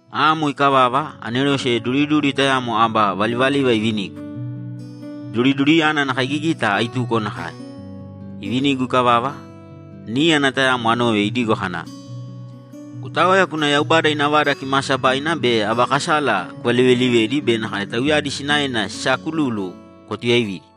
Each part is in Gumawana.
Amo ikavava, anerose duriduri tayamo aba valivaliva ivinigu; duriduriyana ana kaigigita aituko nakae. Ivinigu ikavava, níyana tayamo anove idigo kana, ‘Kutāoya kūna Yaubada ina Vada Kimaasabaina be aba kasala kuvalivelivēdi be nakae tauyadi sinaena sisaakululu kwatuyaivīdi.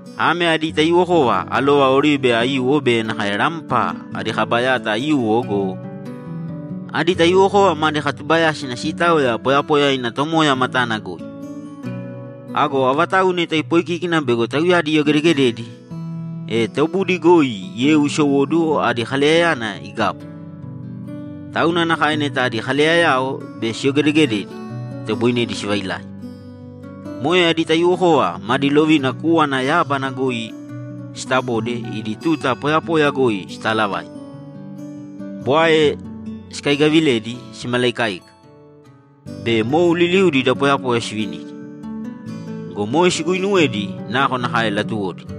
Ame adi taiyuwokova alova oribe aiyuwo be nakae rampa adi kaba yata aiyuwo go, adi taiyuwokova madi katubayásina siitaoya poyapoya ina Tomoya matana goi. Ago avatau neta ipoikíkina bego tauyadi iyogedegededi, e tobudi goi yeu isowóduwo adi kaleyayana igabu. Tauna nakae neta adi kaleyayao bego siyogedegededi, itoboinedi sivailai. Moe adi taiyuwokova madi lovina kúwana yábana goi sitabode idi tuta poyapoya goi sitaalavaita, bwae sikaigaviledi simalaikaika, be mou liliudi da poyapoya sivinidi. Go moe siguinuwedi nakonakae latuwodi.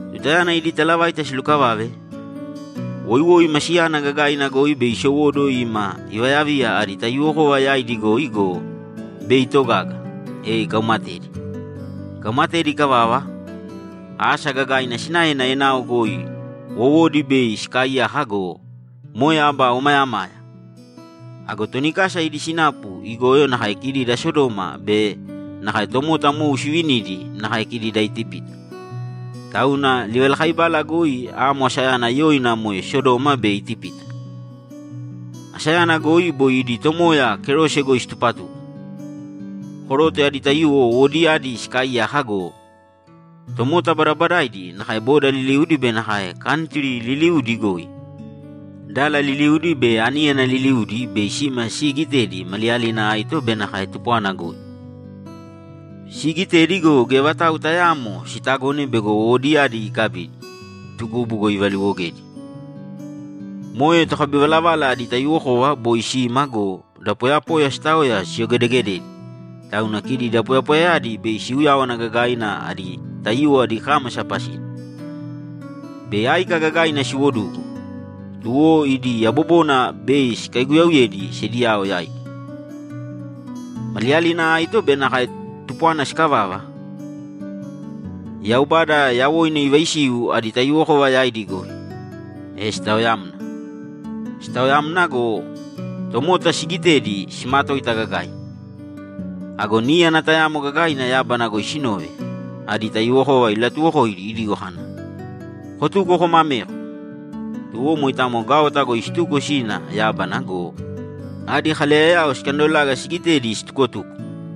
Tutayana idi talavaita silukavave, woiwoi masiyana gagaina goi bei isowóduwo ima ivayaviya adi taiyuwokova yaidi goi go, bei itogaga, e ikaumatedi. Ikaumatedi ikavava, asa gagaina sinaena enao goi wowodi bei sikaaiyaka go, moe aba omayamaya. Ago toni kasa idi sinapu igoyo nakae kidi da Sodoma be nakae tomota mou sivinidi nakae kidi da Itipita. Tauna livalakaibala goi amo asayana yoina moe Sodoma be Itipita. Asayana goi boi idi Tomoya kerose goi situpatuko. Koroto adi taiyuwo wowodiyadi sikaaiyaka go, tomota badabadaidi nakae boda liliudi be nakae kantri liliudi goi, dala liliudi be aníyana liliudi bei sima siigitedi maliyalina aito be nakae tupwana goi. Siigitedi go, geya vatau tayaamo sitagone bego wowodiyadi ikabidi, tukubu goi ivaliwogedi. Moe tokabivalavala adi taiyuwokova boi sima go, da poyapoya sitaoya siyogedegededi, tauna kidi da poyapoyayadi bei siuyáwana gagaina adi taiyuwo idi kámasa pasina. Bei áika gagaina siwodugu, tuwo idi yabobona bei sikaiguyauyedi sediyao yaidi. Maliyalina aito be nakae tupwana sikavava, Yaubada yawoina ivaisiu adi taiyuwokova yaidi goi, e sitaoyamna. Sitaoyamna go, tomota sigitedi simatoita gagaina. Ago níyana tayamo gagaina yábana goi sinove, adi taiyuwokova ilatuwokoidi idigo kana, ‘Kotūko kōma ameko!’ Tuwo moitamo gaota goi situko sina yábana go, adi kaleyayao sikandolaga sigitedi situkotuko.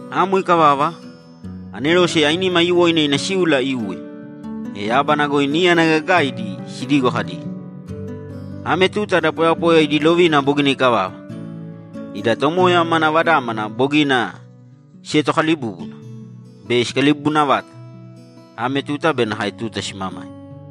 Amo ikavava, anerose ainima aiyuwoina ina síula iuwe, e yábana goi níyana gagaidi sidigo kadi, ‘Ame tuta da poyapoya idi lovina bogina ikavava! Ida Tomoya mana Vadámana bogina sietokalibúbuna. Bei sikalibubuna vata: Ame tuta be nakae tuta simamaima.’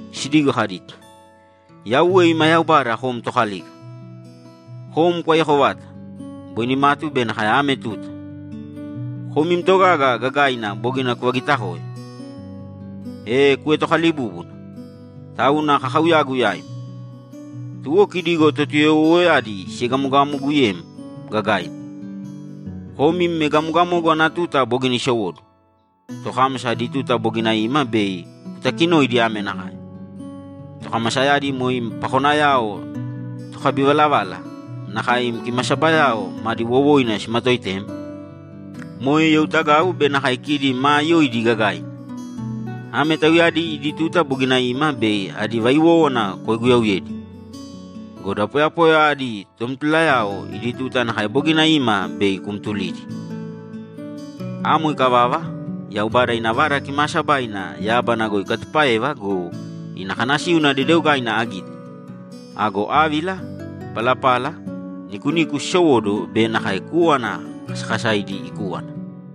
sidigo kadi, ‘Yauwe ima Yaubada kom Tokalika! Kom kwaiyako vata: Boi nimatu be nakae ame tuta! Kom im togaga gagaina bogina kuvagitakoe, e kuetokalibúbuna! Tauna kakauyagu yaim. Tuwo kidi go Totuyoyowoyadi siegamogamoguyem gagaina. Kom im egamogamogu ana tuta bogina isowóduwo. Tokámasa adi tuta bogina ima bei kutakinoidi ame nakae: Tokamasayadi moe im pakonayao tokabivalavala, nakae im kimasabayao madi wowoina simatoitem, moe youtagau be nakae kidi maa yoidi gagaina. Ame tauyadi idi tuta bogina ima bei adi vaiwówana kwaiguyauyedi! Go da poyapoya adi tomtulayao idi tuta nakae bogina ima bei kumtulidi!’ Amo ikavava, Yaubada ina Vada Kimaasabaina yábana goi ikatupáeva go, ina kanasíuna dedeogaina agite. Ago ávila, palapala, nikuniku sisowóduwo be nakae kúwana kasakasaidi ikúwana.